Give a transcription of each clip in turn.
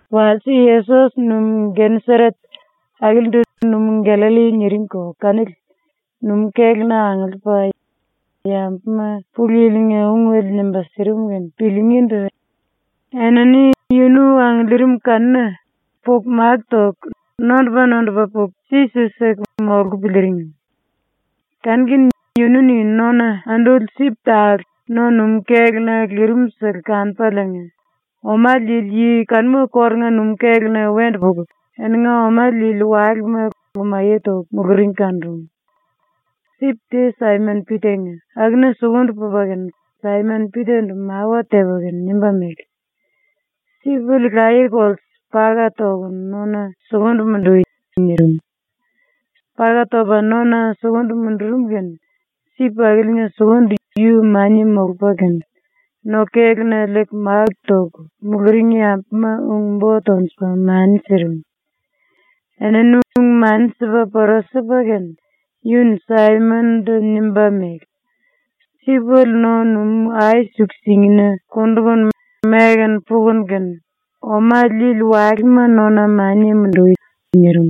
Walse, Yesos numú Geneseret, ⸤akilindu ‘Numú Gallalli’ niringko kanili,⸥ numú-kéluna angiliipa yambuma Pulu Yili-nga ungele nimba sirim kene piliingíndu enini yunu angiliirim kanuna puku máku toku nondupa-nondupa puku si-si siku molku piliiring. Kanu-kene yunu-ni nona anduli sip tale no-numú-kéluna lirim-sele kanupaliinga, oma liili yi kanuma kórunga numú-kéluna wendu puku eninga oma liili walema lumaye toku muluring kanurum. Sip te Saimon-Pita-nga, akuna sukundu pupa kene Saimon-Pita-ndu mawa tepa kene nimba mele: “Sipele laye-kolte paka tokunu nona sukundu mundui.” nirim. Paka topa nona sukundu mundurum kene sip akiliinga sukundu yu mania molupa kene, no-kéluna liiku máku toku muluring yambuma ung-bo tonjupa mani sirim. Enini ung-mani sipa pora sipa kene yu-ni Saimon-ndu nimba mele: “Sipele no-numú ai-suku-singina kundukunu meku pukunu kene oma liili walema nona mania mundui.” nirim.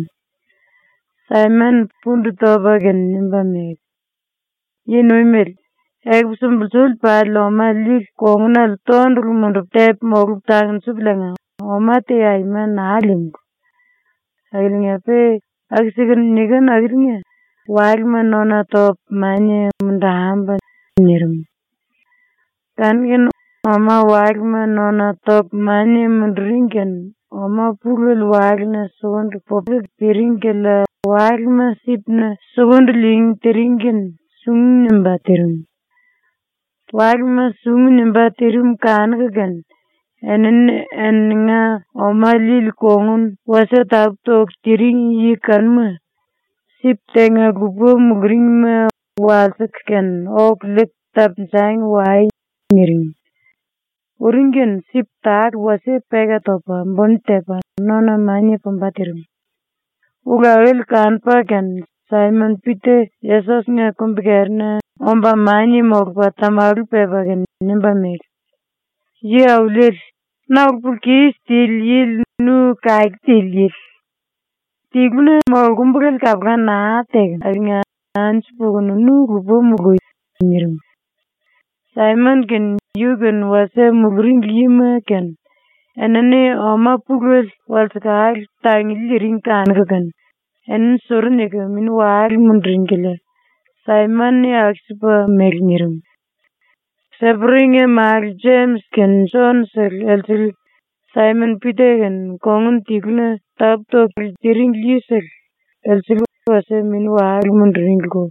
Saimon-ni pundu topa kene nimba mele: “Yi-Nuimele, ekupu sumbulsuli pali oma liili kongunale tondulu mundupu tepu molupu tangnjupuliinga oma te aima naa líímulu. Akiliinga-pe aku-sikunu nikinu akiliinga walema nona topu mania mundambu.” nirim. Kanu-kene oma-walema nona toku mania munduring kene oma pulele walena sukundu puku piring kilia walema sipna sukundu liingí tiring kene sungu nimbá tirim. Walema sungu nimbá tirim kanuku kene enini eninga oma liili kongun wasie tapú-toku tiring yi kanuma, sip tenga-lupa muluringma walsiku kene “Oku liiku tapunjangi wai.” niring. Uring kene sip tale wasie peka topa buni tepa nona mania pumba tirim. Ulu akili kanupa kene Saimon-Pita Yesos-nga kumbi-kerina omba mania molupa tamalu pepa kene nimba mele: “Yi-Auliele, na ulu-pulu-kis tili yili ⸤nu kake tili yili⸥. ⸤Tiluna molkumbulele kapula naa tekem⸥ aliinga anju pukunu nu lupa mului.” nirim. Saimon kene, yu-kene wasie muluring yima kene, enini oma pulele walsekale tanguli liiring kanuku kene enini suru niku mini-wale munduring kilia ⸤Saimon-ni aku-sipa mele nirim⸥. Seperi-nga málu Jemis kene Jon-sele elsele Saimon-Pita kene kongun tiluna tapú-tokulu tiringli yisele, elsele wasie mini-wale munduringliko.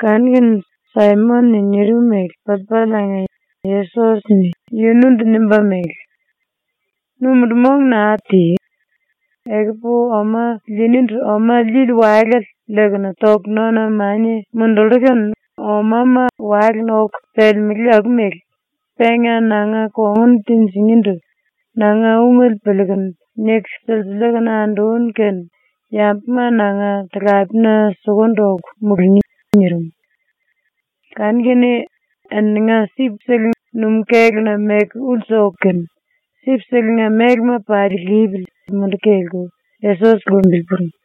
Kanu-kene Saimon-ni nirim mele piliipaliinga Yesos-ni yunundu nimba mele: “Nu mundu-mong naa ti. Ekupu oma liinindu oma liili walale liikunu toku nona mania mundullú kene omama walena oku pelemelé aku mele, penga nanga kongun tinjinindu nanga ungele piliikunu niku silsiliiku anduni kene yambuma nanga talapena sukundu oku mulungí.” nirim. Kanu-kene eninga sip-sele numú-kéluna meku ulsu oku kene, sip-selenga mélema pali lipili munduku kelku Yesos lumbili puring.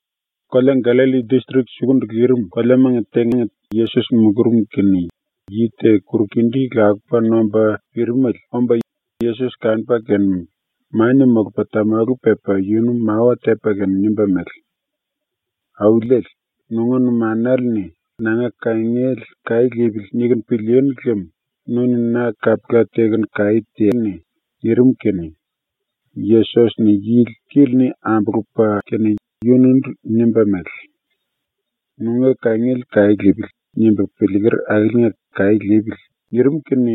⸤Kolea Gallalli distrik sukundu lirim⸥ koleamanga tenga Yesos mulurum kene yi te kuru-kindí lakupa nomba pirimele omba Yesos kanupa kene mania molupa tamalu pepa yunu mawa tepa kene nimba mele: “Auliele, nunga numanale-ni ‘Nanga kangiele kaí lipili.’ nikunu pilíínu lem nu-ni na kapula tekunu kaí teani.” nirim kene Yesos-ni yili kili-ni ambulupa kene yunundu nimba mele: “‘Nunga kangiele kaí lipili.’ nimbu piliiker akiliinga kaí lipili.” nirim kene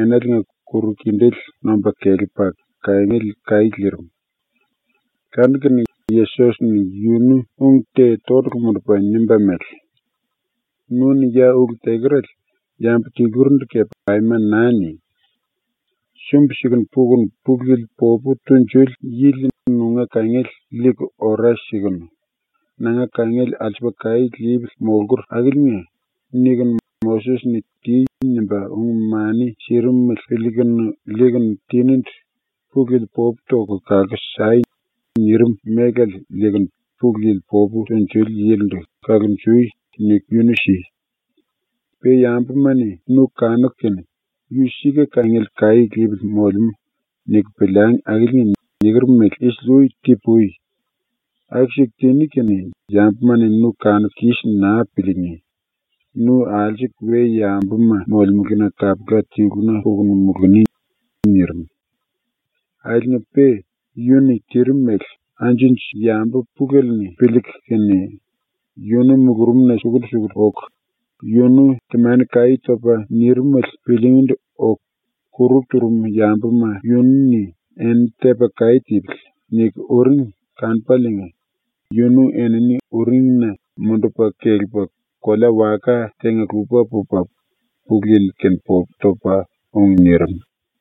enaliinga kuru-kindéle nomba kelepa kangiele kaí lirim. Kanu-kene Yesos-ni yunu ung te tondulu mundupa nimba mele: “Nu-ni ya ulu tekerale yambu tilurindu kepe aima naa ni! Sumbi-sikunu pukunu Pulu Yili popu tunjuli yili nunga kangiele liiku ora sikunu, ‘Nanga kangiele alsupu kaí lipili molkur akiliinga.’ nikunu Moses-ni “Ti.” nimba ung-mani sirimele piliikunu liikunu tinindu “Pulu Yili popu toku kalku sai.” nirim mélale liikunu Pulu Yili popu tunjuli yilindu “Kalonjui.” niku yunu si. Pe yambuma-ni nu kanuku kene ‘Yu sika kangiele kaí lipili molemú.’ niku piliangi akiliinga niker mele isili-ui ti-pui. ⸤Aku-siku tiní kene yambuma-ni nu kanuku kis naa piliingí, nu alsuku we-yambuma molemelena kapula tiluna pukunu muluni.⸥” nirim. Akiliinga-pe yunu-ni tirim mele anju-anju yambu pulele-ni piliiku kene yunu mulurumna sukundu-sukundu oku yunu temani-kaí topa nirimele piliingíndu oku, kuru turum yambuma yunu-ni ‘Enini tepa kaí tipili.’ niku uring kanupaliinga yunu enini uringina mundupa kelepa kolea-waka tenga-lupa pupa Pulu Yili-kene popu topa ung nirim.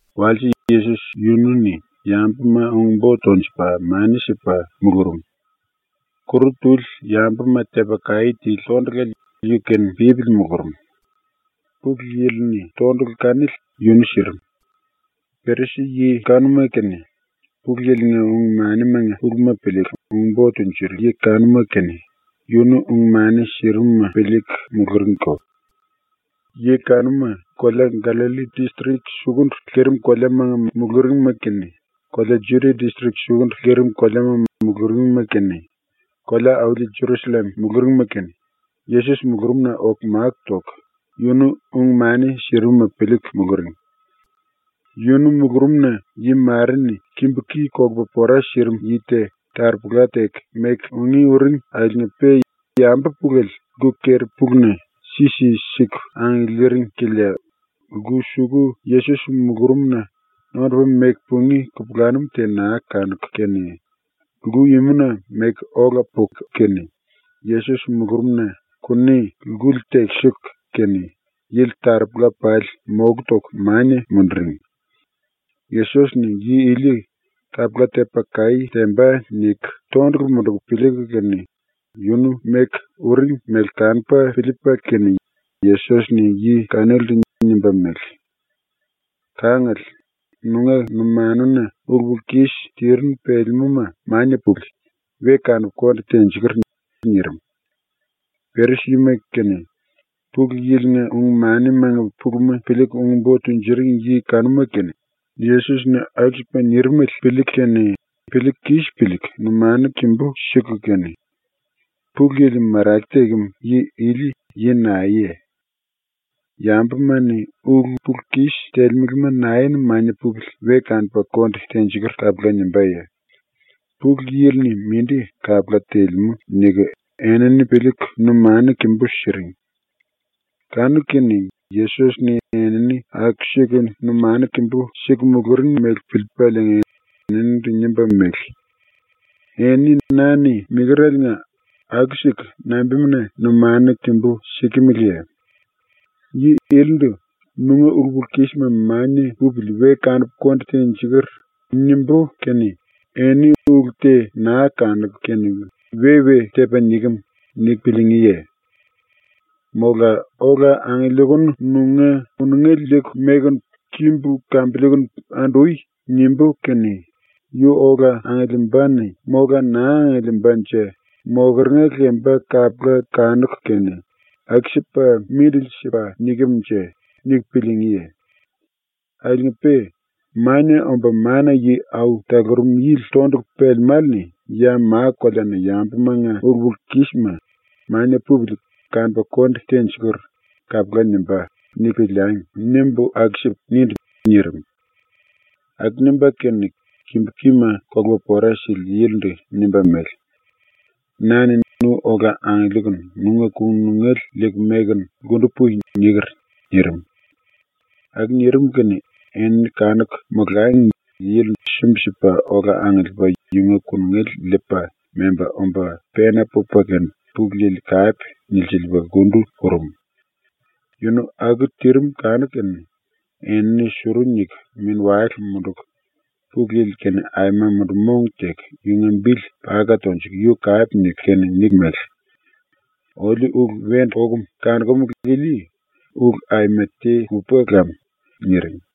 Walse Yesos yunu-ni yambuma ung-bo tonjupa mani sipa mulurum. Kuru tuli yambuma tepa kaí tili tondulale yu-kene pípili mulurum. Pulu Yili-ni tondulu kanili yunu sirim. Perisi-yi kanuma kene, Pulu Yili-nga ung-manimanga puluma piliiku ung-bo tunjuring yi kanuma kene, yunu ung-mani sirimuma piliiku muluringko. Yi kanuma, kolea Gallalli distrik sukundu lirim koleamanga muluringma kene, kolea Judia distrik sukundu lirim koleamanga muluringma kene, kolea-auli Jerusallem muluringma kene, Yesos mulurumna oku máku toku yunu ung-mani sirimuma piliiku muluring. Yunu mulurumna yi mare-ni kimbu-ki kolupa pora sirim yi te taropola teku meku ungí uring akiliinga-pe yambu pulele lku keri-puluna si-si siku angiliiring kilia lku suku Yesos mulurumna nondupa meku pungí kupulanum te naa kanuku kene, lku-imuna meku ola puku kene Yesos mulurumna ⸤kuni lkuli tekisiku kene⸥ yili taropola pali moku toku mania munduring. ‘Yesos-ni yi ili kapula tepa kaí temba.’ niku tondulu munduku piliiku kene yunu meku uring mele kanupa piliipa kene Yesos-ni yi kanilindu nimba mele: “Kangale, nunga numanuna ulu-pulu-kis tirinu pelemúma mania pupili, we kanupu konde tenjikur.” nirim. Perisi-yima kene, Pulu Yili-nga ung-manimanga puluma piliiku ung-bo tunjuring yi kanuma kene, Yesos-ni aku-sipa nirimele piliiku kene ⸤piliiku kis piliiku⸥ numanu kimbú siku kene, “Pulu Yili marake tekem yi ili yi naeye? Yambuma-ni ulu-pulu-kis telemelema nae-ni ‘Mania pupili, we kanupu konde tenjikur.’ kapula nimbáye? Pulu Yili-ni mindi kapula telemú.” niku enini piliiku numanu kimbú siring. Kanu-kene Yesos-ni enini aku-siku numanu kimbú siku muluring mele piliipaliinga eninindu nimba mele: “Eni ⸤na-ni nikereliinga⸥ aku-siku nambimuna numanu kimbú sikimiliye? Yi ilindu “Nunga ulu-pulu-kisma mania pupili, we kanupu konde tenjikur.” nimbú kene eni ulu te naa kanuku kene ‘We-we tepa nikem.’ niku piliingíye? Mola “Ola angiliikunu nunga kunungele liiku mekunu kimbu kambiliikunu andui.” nimbú kene yu ola angiliimbane mola naa angiliimbanje mokeringa lemba kapula kanuku kene ‘Aku-sipa mindili sipa nikem-nje?’ niku piliingíye? Akiliinga-pe ‘ ‘Mania Omba Mana-Yi Au Talurum Yili tondulu pelemále-ni ya ma-koleana yambumanga ulu-pulu-kisma “Mania pupili, kanupu konde tenjikur.” kapula nimbá.’ niku piliangi.’ nimbu ⸤aku-sipu nindu⸥.” nirim. Aku nimba kene kimbu-kima kolupa pora sili yilindu nimba mele: “Na-ni ‘Nu ola angiliikunu nunga kunungele liiku mekunu lkundu pui.’ niker.” nirim. Aku nirim kene enini kanuku molangi yili sumbi-sipa ola angiliipa yunga kunungele liipa memba omba pena pupa kene Pulu Yili kape nilsiliipa lkundu purum. ⸤Yunu aku tirim kanuku kene⸥ enini suru niku mini-wale munduku Pulu Yili-kene aima mundu-mong teku yunga bili paka tonjuku yu kape niku kene niku mele: “Oliu ulu wendu okum kanokumulu ili ulu aima te lupa lam.” niring.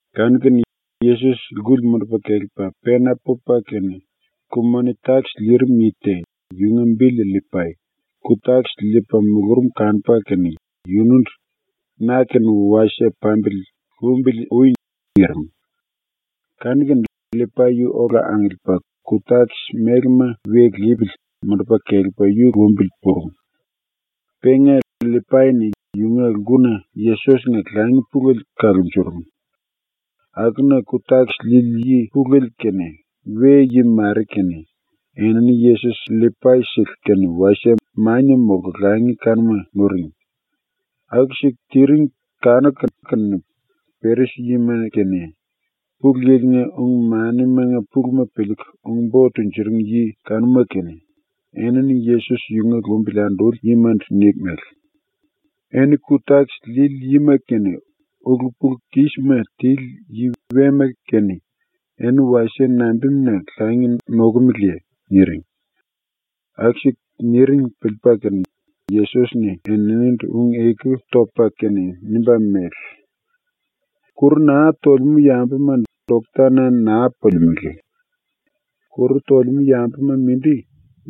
Kanu-kene Yesos ⸤lkuli mundupa kelepa⸥ pena pupa kene, ku-moni-takis liirim yi te, yunga bili LLipai, ku-takis liipa mulurum kanupa kene yunundu “Na-kene wasie pambili lumbili ui.” nirim. Kanu-kene LLipai yu ola angiliipa ku-takis mélema we lipili mundupa kelepa yu lumbili purum. Penga LLipai-ni yunga lkuna Yesos-nga langi pulele kalunjurum. Akuna ku-takis liili yi pulele kene, we-yi mare kene, enini Yesos LLipai-sele kene wasie mania molku langi kanuma nuring. Aku-siku tiring kanuku kene Perisi-yima kene, Pulu Yili-nga ung-manimanga puluma piliiku ung-bo tunjuring yi kanuma kene, enini Yesos yunga lumbili anduli yimandu niku mele: “Eni ku-takis liili yima kene ulu-pulu-kisma tili yi wema kene eni wasie nambimuna langi nokomeleye?” niring. Aku-siku niring piliipa kene Yesos-ni eninindu ⸤ung-eku topa kene⸥ nimba mele: “Kuru naa tolemú yambuma doktana naa pulimelé. Kuru tolemú yambuma mindi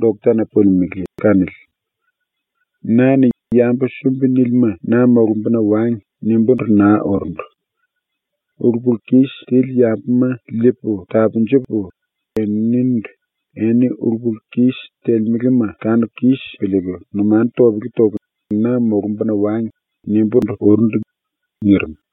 doktana pulimelé kanili. Na-ni ‘Yambu sumbi-nílima na molumbuna wangi.’ nimbúndu naa urundu. Ulu-pulu-kis tili yambuma ⸤liipu tapunjupu⸥ eninindu ‘Eni ulu-pulu-kis telemelema kanuku kis piliiku numanu topele toku ⸤na molumbuna wangi⸥.’ nimbúndu urundu.” nirim.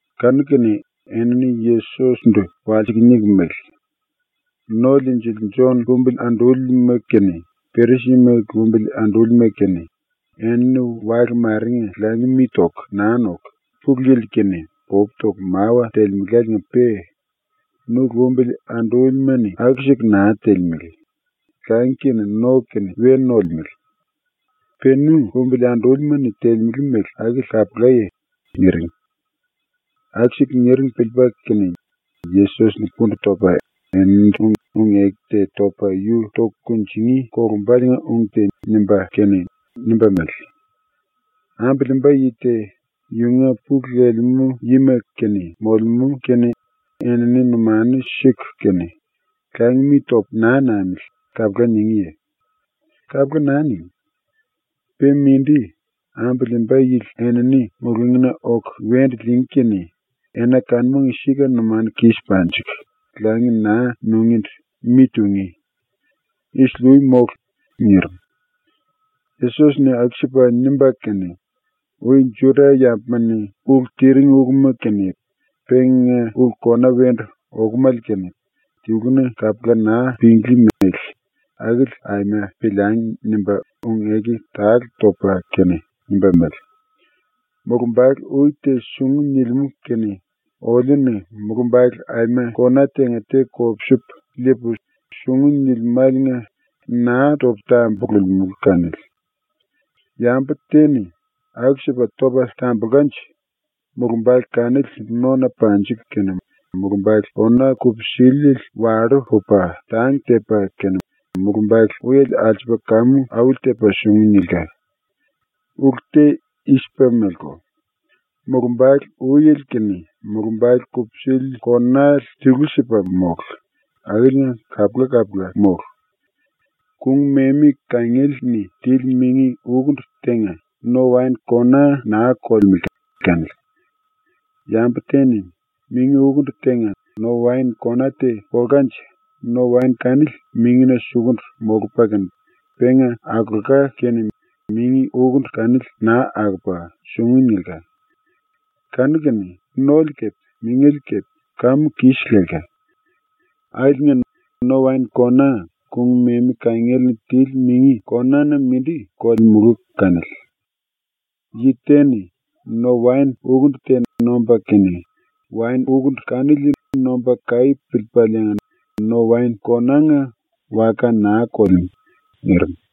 ⸤Kanu-kene⸥ enini Yesos-ndu walsiku niku mele: “⸤No-Liinjili⸥ Jon lumbili andúlima kene, Perisi-yima lumbili andúlima kene, enini wale marenga langi mi toku naa noku Pulu Yili-kene popu toku mawa telemeláliinga-pe nu lumbili andúlima-ni aku-siku naa telemele, langi kene no kene we nolemele. ⸤Pe nu lumbili andúlima-ni telemele mele akili kapulaye⸥?” niring. Aku-siku niring piliipa kene Yesos-ni pundu topa eninindu ⸤ung-eku te topa yu toku kunjingí kolumbaliinga ung te nimba kene⸥ nimba mele: “Ambu liimba yi te yunga pulu lelemú yima kene molemú kene enini numanu siku kene “Langi mi topu naa namili.” kapula ningíye? ⸤Kapula naa ningí.⸥ Pe mindi, ambu liimba yili enini mulungína oku wendu liingí kene ena kanumanga sika ⸤numanu kis panjiku⸥ langi naa nungíndu mi tungí. ⸤Isili-ui mólu.⸥” nirim. Yesos-ni aku-sipa nimba kene, ⸤‘Ui Juda-yambuma-ni ulu tiring uluma kene penga ulu kona wendu okomale kene tiluna kapula naa pinglí mele akili aima piliangi.’ nimba⸥ ung-eku tale topa kene nimba mele: “Mulumbale ui te sungu nilimú kene oliu-ni mulumbale aima kona tenga te kopsupu liipu, sungu nilimáliinga naa topu tambululimulu kanili. Yambu te-ni aku-sipa topa tambulkanje mulumbale kanili nona panjilka kene mulumbale kona kupsiliele wallú pupa tang tepa kene mulumbale uiele alsupa kamu auli-tepa sungu nilka. Ulu te i-sipa meleko: Mulumbale uiele kene mulumbale kupsili konale tilu-sipa mólu, akiliinga kapula-kapula mólu. Kung-memi kangiele-ni tili mingi ukundu tenga no-waen kona naa kolemulu kanili. Yambu te-ni mingi ukundu tenga no-waen kona te kolkanje no-waen kanili mingina sukundu molupa kene penga akolka kene mingi ukundu kanili naa akopa sungu nilka. Kanu-kene nole kepe mingele kepe kamu kis lelka. Akiliinga no-waen kona kung-memi kangiele-ni tili mingi kona-na mindi kolemulu kanili. Yi te-ni no-waen ukundu te nomba kene waen ukundu kanili nomba kaí piliipaliinga no-waen konánga waka naa kolemú.” nirim.